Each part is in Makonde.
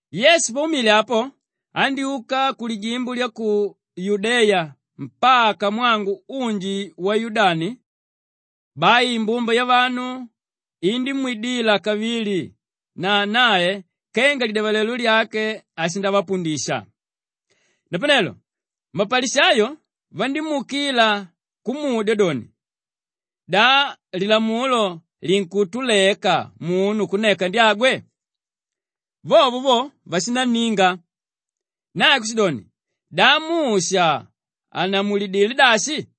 Yesu paumile apo, andyúka kulijimbo lya Yudeya mpaka mwangu unji wa Yudani. Bai imbumba yavanu indímwidila kavili na nae kenga lidyavalelo lyake ashindavapundisha. Napanelo mapalishayo vandímuukila kumudya doni, “Da lilamulo linkutuleka munu kunneka ndyagwe?” Vovo vo, vashinanninga. Nae kushidoni, “Da Musha annamulidilé dashi?”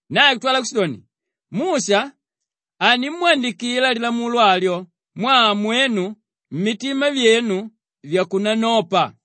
Nae kutwala kushidoni, “Musha andimwandikila lilamulo alyo mwaa mwenu mitima vyenu vyakunanopa.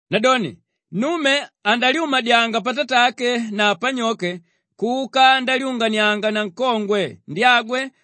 ‘Nadoni nnume andalyumadyanga patatake na panyoke kuka ndalyunganianga na nkongwe ndyagwe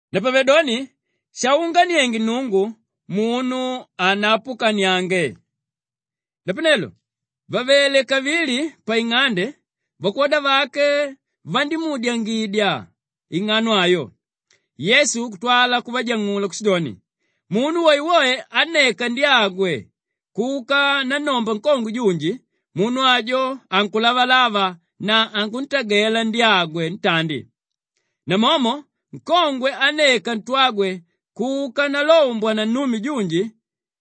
Napavedoni shaunganienge Nnungu, munu hanapukaniange.” Napanelo vavele kavili paing'ande, vakwoda vake vandímuudyangidya ing'ano ayo. Yesu kutwala kuvajang'ula kushidoni, “Munu woewoe ánneka ndyagwe kuka nannomba nkongwe junji, munu ajo ankulavalava na ankuntagela ndyagwe ntandi. Namomo nkongwe ánneka ntwagwe kuka ndalombwa na nnume junji,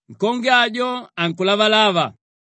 nkongwe ajo ankulavalava.”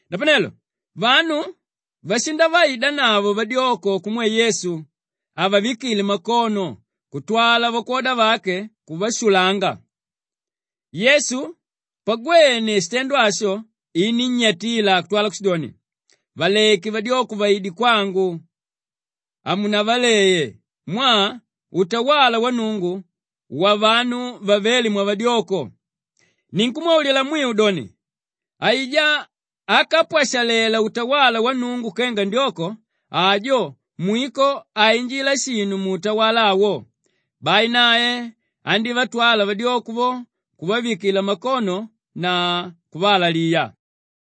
Napanelo vanu vashindavaidanavo vadyoko kumwe Yesu avavikile makono kutwala vakwoda vake kuvashulanga. Yesu pagwene shitendo asho inínnyatila kutwala kushidoni, “Valeke vadyoko vaide kwangu, hamunavaleye mwaa utawala wa Nnungu wavanu vavéle mwavadyoko. Ninkumwaulila mwiu doni, aijá ákapwashalela utawala wa Nnungu kenga ndyoko, ajo mwiko hainjila shinu muutawala awo.” Bai nae andívatwala vadyoko vo kuvavikila makono na kuvaalaliya.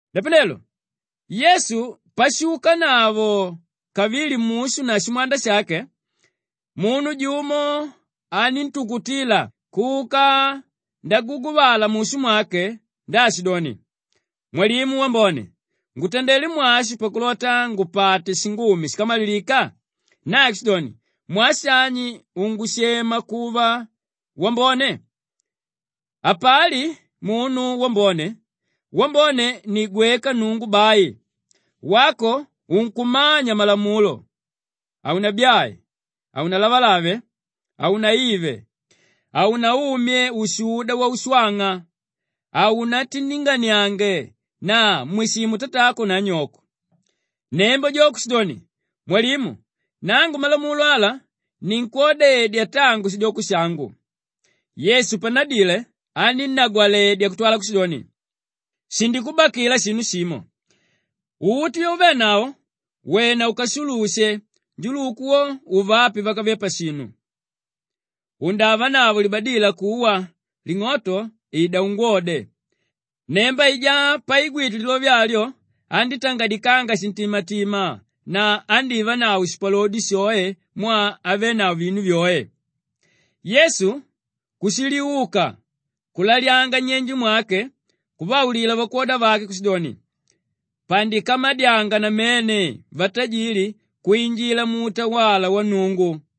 Napanelo Yesu pashuukanavo kavili mushu na shimwanda shake, munu jumo aníntukutila kuka ndaguguvala mushu mwake ndaashidoni, “Mwalimu wambone, ngutandelé mwashi pakulota ngupate shingumi shíkamalilika?” Nae kushidoni, “Mwaa shani ungushema kuva wambone? Hapali munu wambone; wambone ni gweka Nnungu bai. Wako unkumanya malamulo, ‘Haunabyae, Haunalavalave, Haunaive, Haunaumye ushuda waushwang'a, Haunatindinganiange na Mwishimu tatako na anyoko.’” Nnemba jo kushidoni, “Mwalimu, nangu malamulo ala ninkwodedya tangu shidyoko shangu.” Yesu pannadile aninnagwaledya kutwala kushidoni, “Shindikubakila shinu shimo. Uti vyauvenavo wena ukashulushe, njuluku wo uvape vákave pashinu. Undavanavo libadila kuwa; ling'oto, ida ungwode.” Nnemba aijá paigwite lilove alyo andítangadikanga shintimatima na andívanavo shipalodi shoe mwaa avenavo vinu vyoe. Yesu kushiliuka kulalyanga nnyenje mwake kuvaulila vakwoda vake kushidoni, “Pandikamadyanga namene vatajili kwinjila muutawala wa Nnungu!”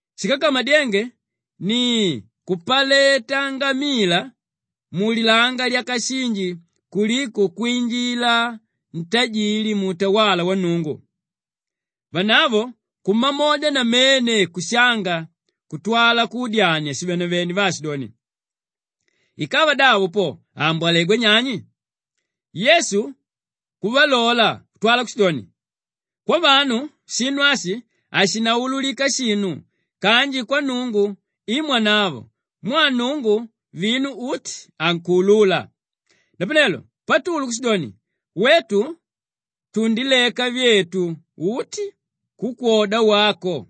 Shíkakamadyenge ni kupaleta ngamila mulilanga lyakashinji kuliko kwinjila ntajili muutawala wa Nnungu.” Vanavo kumamodya namene kushanga kutwala kudyania shivenevene vaashidoni, “Ikava davo po, aambwalegwa nyani?” Yesu kuvalola kutwala kushidoni, “Kwavanu shinu ashi hashinaululika shinu kanji kwa Nnungu i mwanavo mwaa Nnungu vinu uti ankuulula.” Napanelo Patulu kushidoni, “Wetu tundileka vyetu uti kukwoda wako.”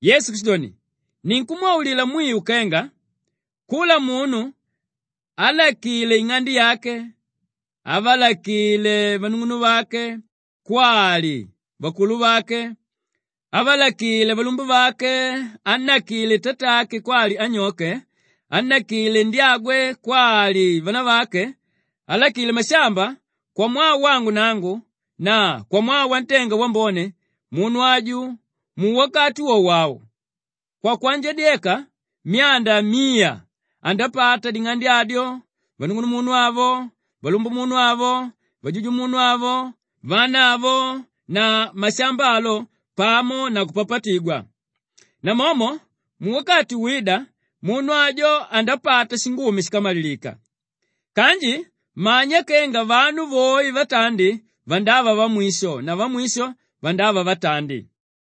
Yesu kushidoni, “Ninkumwaulila mwiu kenga, kula munu álakile ing'ande yake, ávalakile vanung'unuvake kwali vakuluvake, ávalakile valumbuvake, ánnakile tatake kwali anyoke, ánnakile ndyagwe kwali vanavake, álakile mashamba kwamwaa wangu nangu na kwamwaa wantenga wambone, munu aju muwakati wowo au, kwakwanjadyeka myanda miya andapata ding'ande adyo, vanung'unumunu avo, valumbumunu avo, vajujumunu avo, vana avo na mashamba alo pamo na kupapatigwa. Namomo muwakati wída, munu ajo andapata shingumi shíkamalilika. Kanji manya kenga vanu voe vatandi vandava vamwisho na vamwisho vandava vatandi.”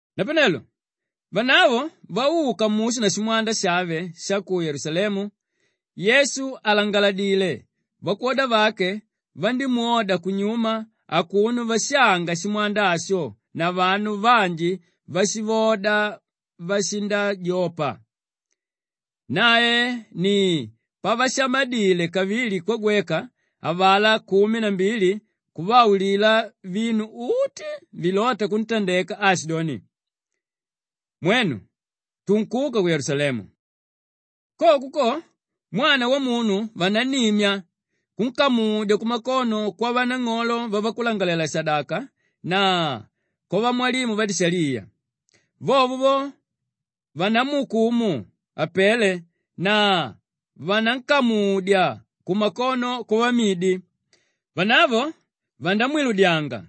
Napanelo vanavo vauka mushu na shimwanda shave sha ku Yelusalemu, Yesu àlangaladile vakwoda vake vandímwoda kunyuma akuno vashanga shimwanda asho na vanu vanji váshivoda vashindajopa. Nae ni pavashamadile kavili kwagweka avalá kumi na mbili kuvaulila vinu uti vilóta kuntandeka aashidoni, “Mwenu, tunkuka ku Yelusalemu. Koko ko, Mwana Wamunu vanannimya kunkamudya kumakono kwavanang'olo vavakulangalalela-shadaka na kwavamwalimu vadishaliya. Vovo vo, vandamuukumu apele na vanankamudya kumakono kwavamidi. Vanavo vandamwiludyanga,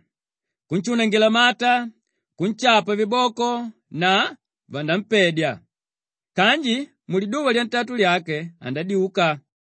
kunshunangila mata, kunshapa viboko na vanampedya. Kanji muliduva lyantatu lyake andadyuka.”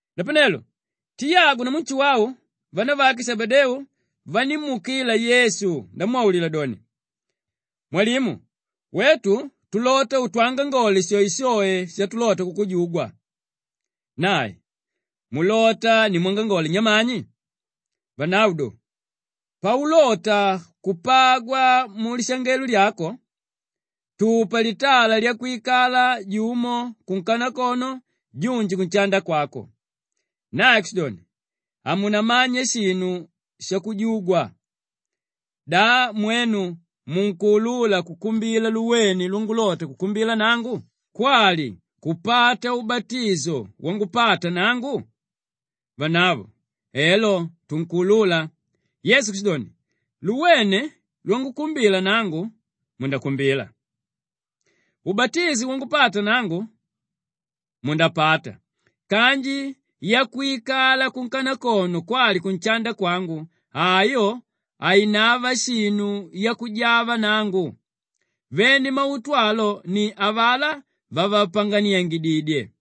Napanelo Tiyagu namu Nshuwau vanavake Shebedeu vandímuukila Yesu ndamwaulila doni, “Mwalimu, wetu tulota utwangangole shoeshoe shatulota kukujugwa.” Nae, “Mulota nimwangangole nyamani?” Vanavo do, “Paulota kupagwa mulishangelo lyako, tupa litala lyakwikala, jumo kunkanakono junji kunshanda kwako.” Nae kushidoni, “Hamunamanya shinu shakujugwa. Da mwenu munkuulula kukumbila luwene lwangukumbila nangu kwali kupata ubatisho wangupata nangu?” Vanavo, “Elo, tunkuulula.” Yesu kushidoni, “Luwene lwangukumbila nangu, mundakumbila. Ubatisho wangupata nangu, mundapata kanji yakwikala kunkanakono kwali kunshanda kwangu, ayo hainava shinu yakujava nangu. Vene mautu alo ni avalá vavapanganiangididye.”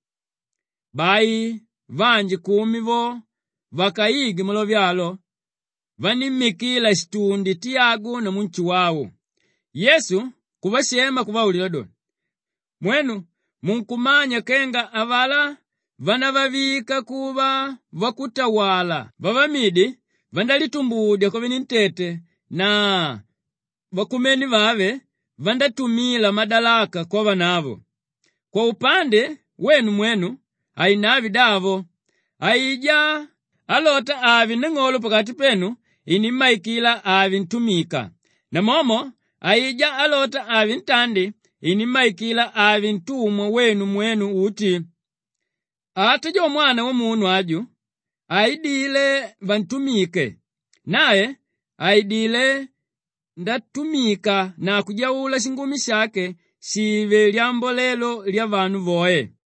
Bai vanji kumi vo vakaigwe malove alo, vanímmikila shitundi Tiyagu namu Nshuwau. Yesu kuvashema kuvaulila doni, “Mwenu munkumanya kenga avalá vánavavika kuva vakutawala vavamidi vandálitumbudya kwavenentete na vakumene vave vandátumila madalaka kwavanavo. Kwaupande wenu mwenu hainave davo. Aijá álota ave nang'olo pakati penu inimmaikila ave ntumika. Namomo aijá álota ave ntandi, inimmaikila ave ntumwa wenu mwenu uti. Ata jo Mwana Wamunu aju haidile vantumike; nae aidilé ndatumika na kujaula shingumi shake shive lyambolelo lyavanu voe.”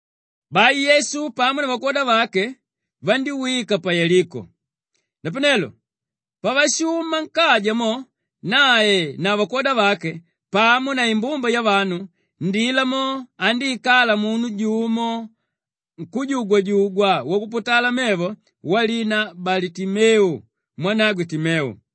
Bai Yesu pamo na vakwoda vake vandíwika pa Yeliko. Napanelo pavashuma nkaja mo nae na vakwoda vake pamo na imbumba yavanu, ndila mo andíikala munu jumo nkújugwajugwa wakuputala mevo walina Balitimeu mwanagwe Timeu.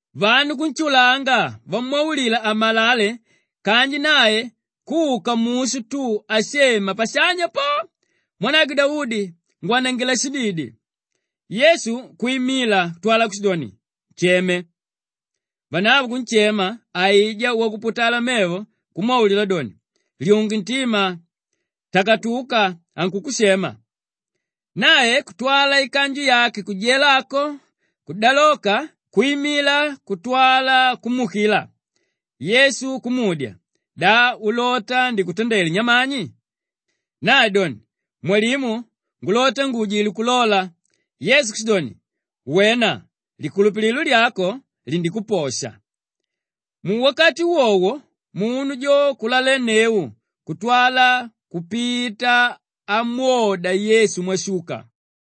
Vanu kunshulanga vamwaulila amalale kanji nae kuka mushu tu ashema pashanya po, “Mwanagwe Daudi, ngwanangila shididi!” Yesu kwimila kutwala kushidoni, “Nsheme!” Vanavo kunshema aijá wakuputala mevo kumwaulila doni, “Lyunge ntima! Takatuka, ankukushema.” Nae kutwala ikanju yake kujela ako, kudaloka kwimila kutwala kumuukila. Yesu kumudya, “Da ulota ndikutandele nyamani?” Nae doni, “Mwalimu, ngulota nguujile kulola.” Yesu kushidoni, “Wena, likulupililo lyako lindikuposha.” Muwakati wowo munu jo kulalenneu kutwala kupita amwoda Yesu mwashuka.